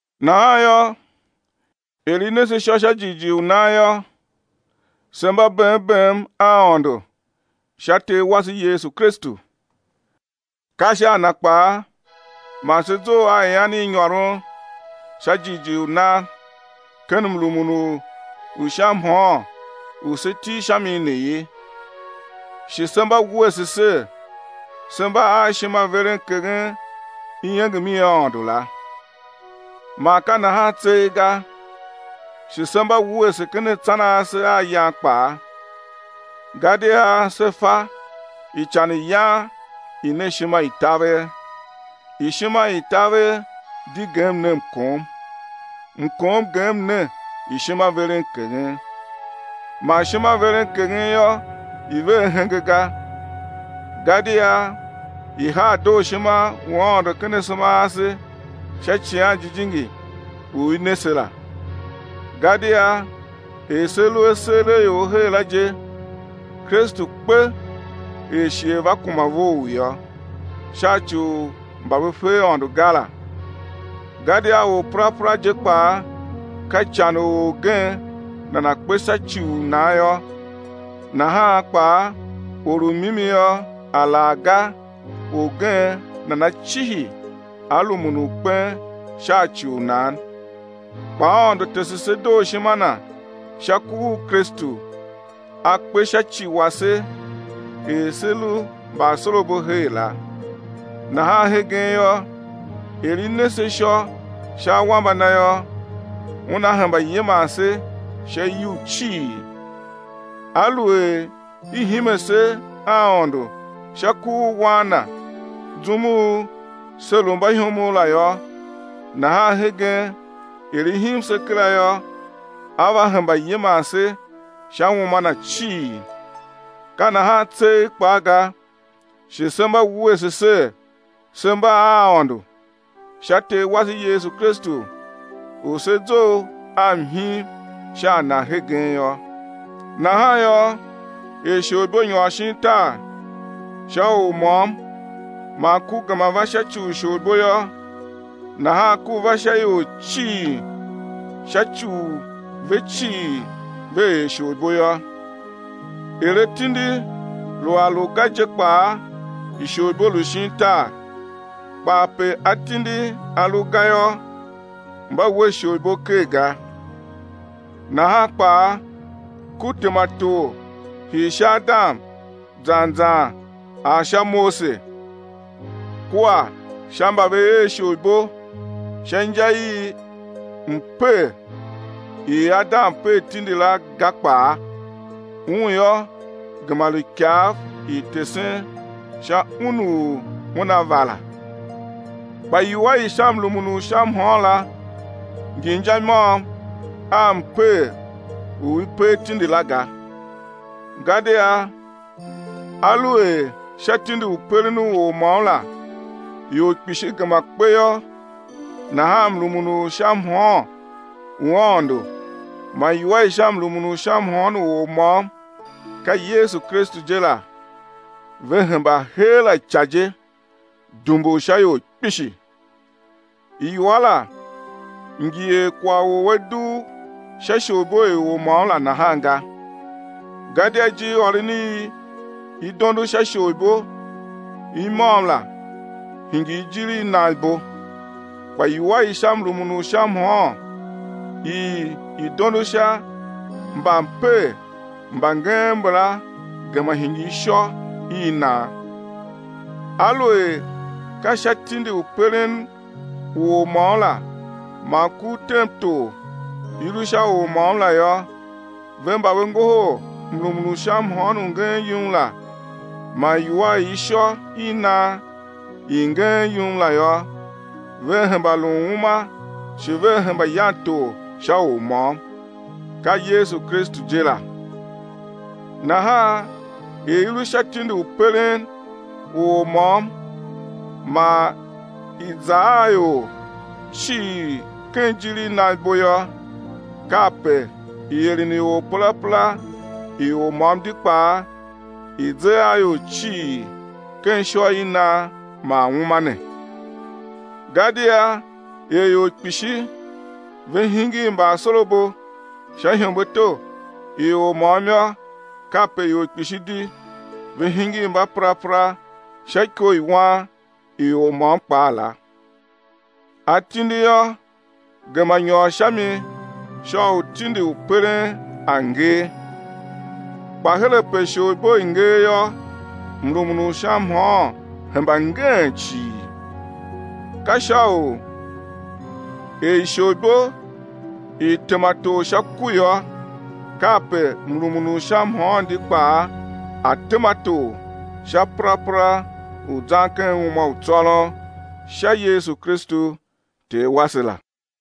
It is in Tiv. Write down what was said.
Nahan yô, er i ne se ishô sha jighjigh u nan yô, se mba bem bem a Aôndo sha Ter wase Yesu Kristu. Ka sha a Na kpaa man se zough a ian i nyôron [sha jighjigh u nan] ken mrumun u sha mhôôn u se til sha mi ne ye, shi se mba wuese ser, se mba a ishimaverenkeghen iengem i Aôndo la. Man ka nahan tseegh ga, shi se mba wuese ken atsan ase a yan kpaa, gadia se fa ican i yan i ne ishimataver, ishimataver di gem ne mkom, mkom gem ne ishimaverenkeghen. Man ishimaverenkeghen yô, i ve ahenge ga, gadia i haa dooshima u Aôndo ken asema ase sha Icighan Jijingi u i ne se la. Gadia er se lu aseeraior her la je Kristu kpe er shighe va kuma vough yô, sha ci u mba ve fe Aôndo ga la. Gadia orperapera je kpaa ka ican u orgen nana kpe sha ci u nan yô, nahan kpaa or u mimi yô, alaghga orgen nana cihi á rumun u kpen sha ci u nan. Kpa Aôndo tese se dooshima Na sha ku u Kristu A kpe sha ci wase er se lu mbaasorabo her la. Nahan hegen yô, er i ne se ishô sha awambe Na yô, Una hemba yiman se sha iyugh cii. Aluer i hime se a Aôndo sha ku u Wan Na zum u se lu mbaihomov la yô, nahan hegen er i him se kera yô, á va hemba yiman se sha uma Na cii. Ka nahan tseegh kpaa ga, shi se mba wuese ser, se mba a Aôndo, sha Ter wase Yesu Kristu u se zough a mhim sha a Na hegen yô. Nahan yô, er isholibo nyôr shin tar sha or môm, man ku gema va sha ci u isholibo yô, nahan ku va sha ior cii sha ci u ve cii ve er isholibo yô. Er atindi lu a lu ga je kpaa isholibo lu shin tar, kpa ape atindi a lu ga yô, mba we isholibo ker ga. Nahan kpaa ku tema tor hii sha Adam zan zan ar sha Mose, kua sha mba ve er isholibo sha inja i mper i Adam per tindi la ga kpaa; un yô, gema lu ikav i tesen sha Un u Una va la. Kpa iwua i sha mrumun u sha mhôôn la ngi inja i môm a mper u i per tindi la ga, gadia aluer sha tindi u peren u or môm la ior kpishi gema kpe yô, nahan mrumun u sha mhôôn u Aôndo man iwua i sha mrumun u sha mhôôn u Or môm, ka Yesu Kristu je la, ve hemba heera ica je, dumbur sha ior kpishi. Iwua la ngi er kwagh u a dugh sha isholibo i or môm la nahan ga. Gadia ijirôron i i dondo sha isholibo i môm la hingir ijir i nan ibo, kpa iwua i sha mrumun u sha mhôôn i i dondo sha mbamper mba ngeen mbala gema hingir ishô i nan. Aluer ka sha tindi u peren u or môm la man ku u tem tor, i lu sha or môm la yô, ve mba ve ngohol mrumun u sha mhôôn u ngeen yum la man iwua i ishô i nan i ngeen yum la yô, vea hemba lun uma shi vea hemba yan tor sha Or môm, ka Yesu Kristu je la. Nahan er i lu sha tindi u peren u or môm man i za a ior cii ken ijir i nan ibo yô, kape ieren i perapera i Or môm di kpaa i ze a ior cii ken ishô i nan man uma ne. Gadia er ior kpishi ve hingir mbaasorabo sha ihembeato i or môm yô, kape ior kpishi di ve hingir mbaperapera sha iko i wan i Or môm kpaa la. Atindi yô, gema nyôr sha mi sha u tindi u peren a̱ ngee. Kpa her ape isholibo i ngee yô, mrumun u sha mhôôn hemba ngeen cii. Ka sha u, er isholibo i tema tor sha ku yô, kape mrumun u sha mhôôn di kpaa a̱ tema tor sha perapera u zan ken uma u tsôron sha Yesu Kristu Ter wase la.